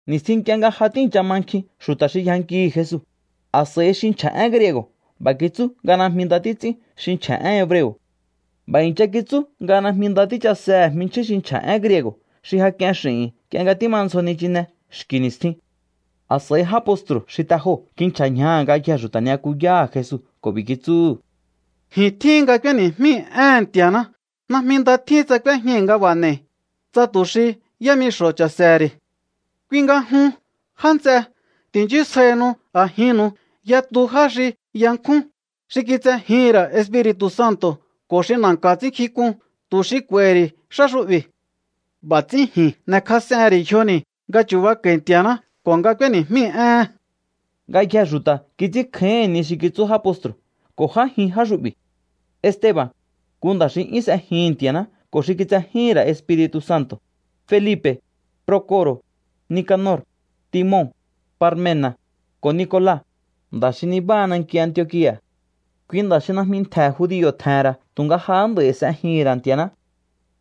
Ni̱stjin nk'ie nga ja tíi̱ncha ma nkjin xu̱ta̱ xi yjankihi̱ Jesu, a̱s'a̱i xi nchja̱ én griego̱ b'a̱ kitsú nga najmi nda títs'ín xi nchja̱ én hebreo̱. B'a̱ i̱ncha kitsú nga najmi nda tíchasehe̱ jminchjín xi nchja̱ én griego̱ xi ja k'ien x'i̱hi̱n nk'ie nga tímandzjo nichine xki̱ ni̱stjin. A̱s'a̱i já postru̱ xi te joo̱ kinchja̱ ñjaha̱ ngayjee̱ xu̱ta̱ ni'yakuyáha̱ Jesu ko̱ b'i̱ kitsúhu̱: —Ji̱n tjíhin nga k'úéni̱jmíi̱ éhe̱n Nti̱a̱ná. Najmi nda tjín tsa k'úéjñai̱ nga b'a̱ n'e̱i̱, tsa tu̱ xi yámixo̱ cha̱se̱he̱ ri̱. Kui nga jun, já nts'e, ti̱nchísjaihinu a̱jinnu̱u yatu já xi yankjún, xi kitsejíhi̱n ra̱ Espiri̱tu̱ Santo̱ ko̱ xi na̱nka̱ ts'ínnkjink'un, tu̱ xi k'u̱a̱i̱hi̱ ri̱ xá xu'bi̱. B'a̱ ts'ín ji̱n n'e̱kjas'ehe̱n ri̱ yjoni̱ nga chu̱bako̱i̱ Nti̱a̱ná ko̱ nga k'úéni̱jmíi̱ éhe̱n. Ngayjee̱ xu̱ta̱ kits'ínkjáíhi̱n ni xi kitsú já postru̱ ko̱ j'ájin já xu'bi̱: Esteba̱n, nku nda̱ xi 'yún s'ejihi̱n Nti̱a̱ná ko̱ xi kitsejíhi̱n ra̱ Espiri̱tu̱ Santo̱, Felipe̱, Proco̱ro̱, Nicanor, Timon, Parmena̱, ko̱ Nicola, nda̱ xi nibáha nanki Antiokia̱. Kui nda̱ xi najmi ntje̱ judio̱ tje̱he̱n ra̱ tu̱nga jahá nd'a̱i s'ejihi̱n ra̱ Nti̱a̱ná.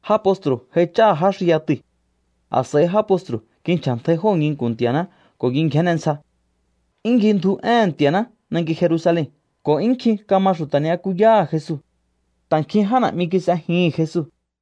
Já postru̱ jaich'áha̱ já xi yatui̱. A̱s'a̱i já postru̱ kinchja̱ntjai jóo̱ nginku̱n Nti̱a̱ná ko̱ kingjénne ntsja. 'Yún ngjindju éhe̱n Nti̱a̱ná nanki Jerusalen ko̱ 'yún nkjin kama xu̱ta̱ ni'yakuyáha̱ Jesu. Ta̱ nkjin já na̱'mi kis'ejihi̱n Jesu.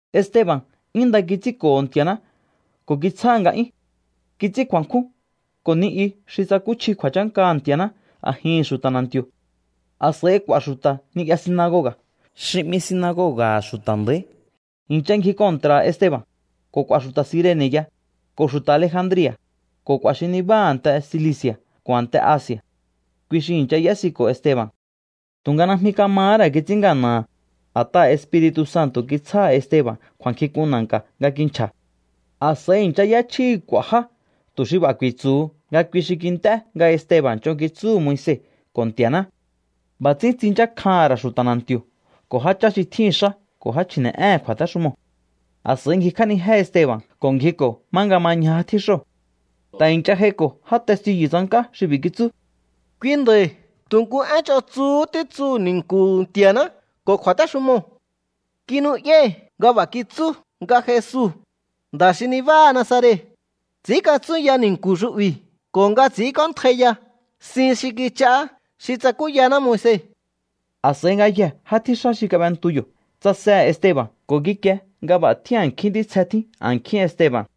Esteba̱n 'yún nda kits'ínko̱ho̱ Nti̱a̱ná ko̱ kitsjáha̱ nga'yún. Kits'ín kju̱a̱nkjún ko̱ ni i xi tsakúchji kju̱a̱chánkaha̱ Nti̱a̱ná a̱jihi̱n xu̱ta̱ na̱nti̱o̱. A̱s'a̱i k'u̱a̱ xu̱ta̱ ni'ya sinagoga̱ xi 'mi Sinagoga̱ha̱ Xu̱ta̱ Nda̱í i̱ncha ngji kontra̱ha̱ Esteba̱n, ko̱ k'u̱a̱ xu̱ta̱ Cirene̱ ya, ko̱ xu̱ta̱ Alejandria̱, ko̱ k'u̱a̱ xi nibáha a̱nte Cilici̱a̱ ko̱ a̱nte Asi̱a̱. Kui xi i̱ncha y'ésiko̱ Esteba̱n. Tu̱nga najmi kamahá ra̱ kits'ín ngana̱ha̱, a̱t'aha̱ Espiri̱tu̱ Santo̱ kitsjáha̱ Esteba̱n kju̱a̱nkjink'un na̱nka̱ nga kinchja̱. A̱s'a̱i i̱ncha y'échjíhi̱ k'u̱a̱ já tu̱ xi b'a̱ ku̱i̱tsu̱hu nga kui xi kint'é nga Esteba̱n ch'on kitsúhu̱ Moise ko̱ Nti̱a̱ná. B'a̱ ts'ín tsinchákjaha̱n ra̱ xu̱ta̱ na̱nti̱o̱ ko̱ jáchá xi tjíhi̱n xá ko̱ já chji̱ne̱'éhe̱n kju̱a̱téxumoo̱. A̱s'a̱i ngjikj'ánijé Esteba̱n ko̱ ngjiko̱ má nga ma ñja já tjíxóo̱. Ta̱ i̱ncha j'aiko̱ já testiyu̱ tsank'á xi b'i̱ kitsú: —Kui nda̱i̱ tu̱ nku én ch'on tsuhú títsuhu̱ ni̱nku̱hu̱ Nti̱a̱ná ko̱ kju̱a̱téxumoo̱. Kinu'yái̱ nga b'a̱ kitsú nga Jesu, nda̱ xi nibáha Nazaret, ts'i̱ínkatsúnya ni̱nku̱ xu'bi̱ ko̱ nga ts'i̱ínk'óntjaiya sin xi kich'aá xi tsakúyaná Moise. A̱s'a̱i ngayjee̱ já tjíxá xi kab'entu yo̱ tsasehe̱ Esteba̱n ko̱ kikie nga b'a̱ tjín a̱nkjín ntítsje tjín a̱nkjín Esteba̱n.